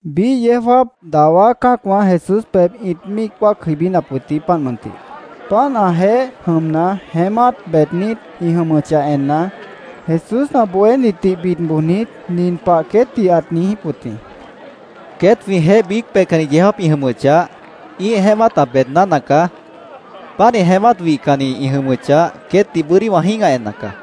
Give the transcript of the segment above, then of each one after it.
Biíh yeó jáap dawá cã́acwã Jesús pebh ĩt míic wáac jʉibínap wʉt jĩ, páant mʉntih. Páant ãjeéh jʉmna, jeémát beednít ĩ jʉmʉchah enna, Jesús ã bohénitdih bid bojnit, nin pah queétdih ãt niijíp wʉt jĩ. —Queét jwĩjeéh biíc peihcanni yeó jáap ĩ jʉmʉchah, ĩ́ih jeémát ã beedná nacaá. Pánih jeémát wihcannit ĩ jʉmʉchah, queétdih bʉ́dí wã jĩ́gah enna caá.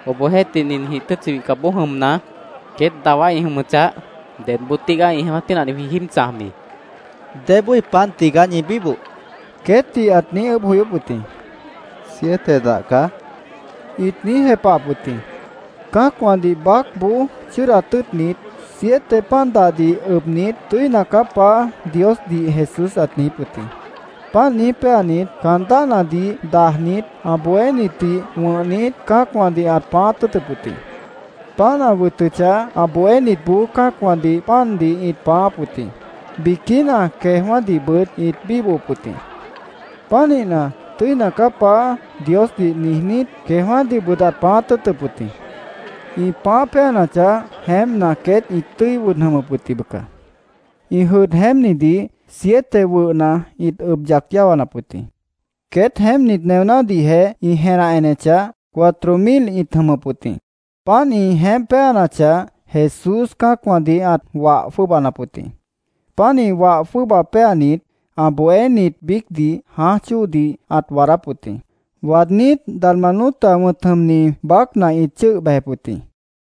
—Obohjeéhtih, ninjĩh tʉ́tchi wihcapboó jʉmna, queét dawá ĩ jʉmʉchah, ¿dedboo tígaá ĩ jeémát pínahdih jwĩ jíib chãjbi? Jesúsdih ĩt niijíp wʉt jĩ. —¿Débói pan dah tigaá ñi bíboh? queétdih ãt niíj ʉʉ́bh joyóp wʉt jĩ. —Siete dah caá, ĩt niíj jepahap wʉt jĩ. Cã́acwãdih baácboó chʉ́ʉdat tʉ́ʉtnit, siete pan dahdih ʉbnit, “Tʉ́ina caá, Paá”, Diosdih Jesús ãt niijíp wʉt jĩ. Páant niíj péanit, caan dáhnadih dajnit, ã bohénitdih wʉ̃hnit, cã́acwãdih ãt pãáát tʉ́ʉtʉp wʉt jĩ. Páant ã wʉtʉchah, ã bohénitboó cã́acwãdih pandih ĩt pãááp wʉt jĩ. Biquína queejwã́dihbʉt ĩt bíbohop wʉt jĩ. Pánihna, “Tʉ́ina caá, Paá”, Diosdih niijnít, queejwã́dihbʉt ãt pãáát tʉ́ʉtʉp wʉt jĩ. Ĩ pãáh péanachah, jeémpna, queét ĩt tʉ́i wʉd jʉmʉp wʉt jĩ, bʉca. Ĩ jʉdh jeémpnidih siete wʉhna ĩt ʉb yac yáwanap wʉt jĩ. Queét jeémpnit neonádihjeh ĩ jenah enechah, cuatro mil ĩt jʉmʉp wʉt jĩ. Páant ĩ jeémp péanachah, Jesús cã́acwãdih ãt wah jwʉ́ʉbanap wʉt jĩ. Pánih wah jwʉ́ʉba péanit, ã bohénit biícdih jãáj chóodih ãt waadáp wʉt jĩ. Waadnít, Dalmanuta wʉ̃t jʉmni baácna ĩt chʉ́ʉh bejep wʉt jĩ.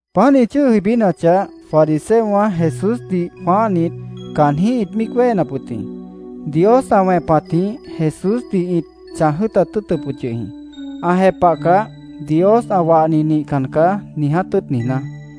Páant ĩ chʉ́ʉh jʉibínachah, fariseowã Jesúsdih jwãáhnit, caanjĩ́h ĩt míic wéhenap wʉt jĩ. Dios ã wẽpatjĩh Jesúsdih ĩt chãj jʉ́ʉtat tʉ́ʉtʉp wʉt yʉh jĩ, ã jepahcah, “Dios ã wahni nihcan caá”, niiját tʉ́ʉt niijná.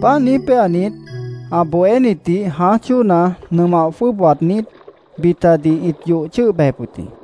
Páant niíj péanit, ã bohénitdih jãáj chóona nʉmah jwʉ́ʉb waadnít, bitadih ĩt yoh chʉ́ʉh bejep wʉt jĩ.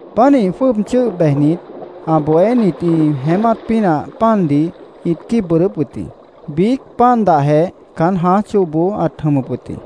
Pánih jwʉ́ʉb chʉ́ʉh bejnit, ã bohénit ĩ jeémát pínah pandih ĩt quíib bʉʉdʉ́p wʉt jĩ. Biíc pan dahjeh caán jãáj chóoboó ãt jʉmʉp wʉt jĩ.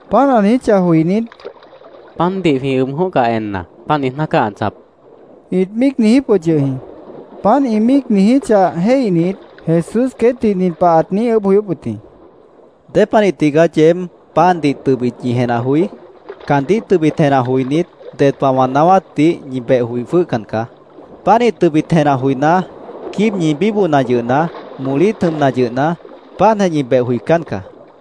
Páant ã niijíchah joinít, “Pandih jwĩ ʉb jʉ̃óhcah enna, páant niijná caá ã chãjap”, ĩt míic niijíp wʉt yʉh jĩ. Páant ĩ míic niijíchah jéihnit, Jesús queétdih nin pah ãt niíj ʉʉ́bh joyóp wʉt jĩ: —¿Dépanih tigaá yeéb pandih tʉbit ñi jenah joí? Caandíh tʉbit jenah joinít, ded pah wã naáwátdih ñi beh joi jwʉ́hcan caá. Pánih tʉbit jenah joiná, quíib ñi bíbohna yʉhna, molít jʉmna yʉhna, páantjeh ñi beh joicán caá.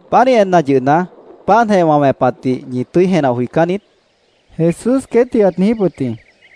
—¿Pánih enna yʉhna, páantjeh wã wẽpatdih ñi tʉ́i jenah joicán niít? Jesús queétdih ãt niijíp wʉt jĩ.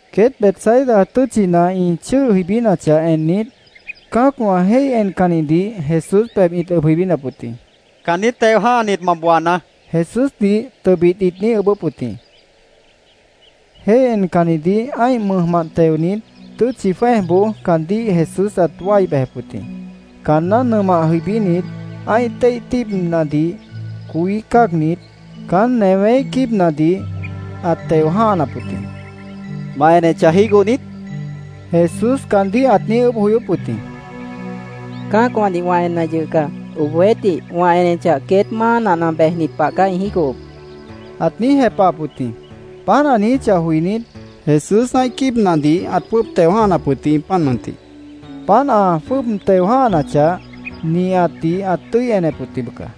Queét Betsaida tʉ́tchina ĩ chʉ́ʉh jʉibínachah ennit, cã́acwã jéih encannidih Jesús pebh ĩt ʉb jʉibínap wʉt jĩ. —Caandíh teo jã́hanit, ma booanaá, Jesúsdih tʉbit ĩt niíj ʉʉ́bʉ́p wʉt jĩ. Jéih encannidih ã́ih mʉjmant teonit, tʉ́tchi jwẽ́ejboó caandíh Jesús ãt wái bejep wʉt jĩ. Caanná nʉmah jʉibínit, ã́ih téih tíibnadih coí cáagnit, caán newéíh quíibnadih ãt teo jã́hanap wʉt jĩ. —¿Ma enechah, jígoh niít? Jesús caandíh ãt niíj ʉʉ́bh joyóp wʉt jĩ. —Cã́acwãdih wã enna yʉh caá. Obohjeéhtih, wã enechah, queét máa nahna bejni pah caá ĩ jígohop, ãt niíj jepahap wʉt jĩ. Páant ã niijíchah joinít, Jesús ã́ih quíibnadih ãt jwʉ́ʉb teo jã́hanap wʉt jĩ, páant mʉntih. Páant ã jwʉ́ʉb teo jã́hanachah, nihatdih ãt tʉ́i enep wʉt jĩ, bʉca.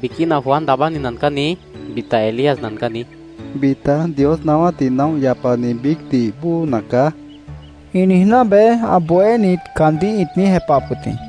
—Biquína ‘Juan Daabáni nacaá’, niíj, bita ‘Elías nacaá’, niíj, bita ‘Dios naáwátdih naóh yapanit biícdih bóo nacaá’, ĩ niijná beé, ã bohénit caandíh ĩt niíj jepahap wʉt jĩ.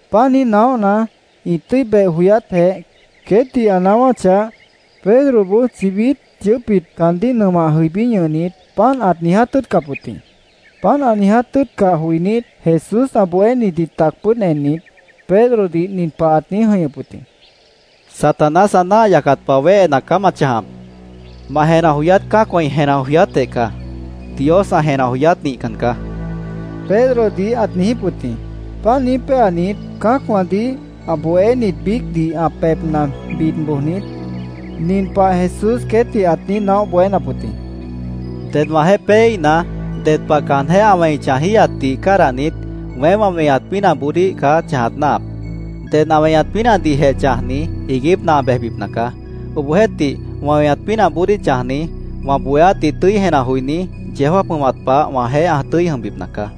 Páant niíj naóhna, ĩ tʉ́i beh joyátjeh queétdih ã naáwáchah, Pedroboó chibít yʉʉ́pbit caandíh nʉmah jʉibí ñʉhnit, páant ãt niiját tʉ́ʉtcap wʉt jĩ. Páant ã niiját tʉ́ʉtcah joinít, Jesús ã bohénitdih tac pʉ́ʉd ennit, Pedrodih nin pah ãt niíj jʉ̃ihñʉp wʉt jĩ: —Satanás ã náah yacat pah wéhena caá ma chãjap. Ma jenah joyát cã́acwã ĩ jenah joyátjeh caá. Dios ã jenah joyát nihcan caá, Pedrodih ãt niijíp wʉt jĩ. Páant niíj péanit, cã́acwãdih, ã bohénit biícdih ã pebhna bid bojnit, nin pah Jesús queétdih ãt niíj naóh bohénap wʉt jĩ: —Ded wãjeéh péeíhna, ded pah caanjéh ã wẽi chãjíhatdih cádahnit, weém wã weñat pínahboodíh caá chãjat náahap. Ded ã weñat pínahdihjeh chãjni, iiguípna ã bejbipna caá. Obohjeéhtih, wã weñat pínahboodíh chãjni, wã bohéátdih tʉ́i jenah joiní, yeó jáap jʉmat pah wãjeéh ã tʉ́i jʉmbipna caá.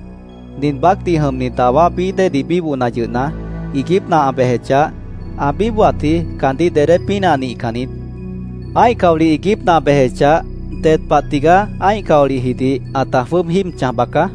Nin baácdih jʉmni dawá bií déedih bíbohna yʉhna, iiguípna ã bejechah, ã bíbohatji caandíh dedé pínah nihcan niít. Ã́ih caolih iiguípna ã bejechah, ded pah tigaá ã́ih caolihjidih ãta jwʉ́ʉb jíib chãj baca.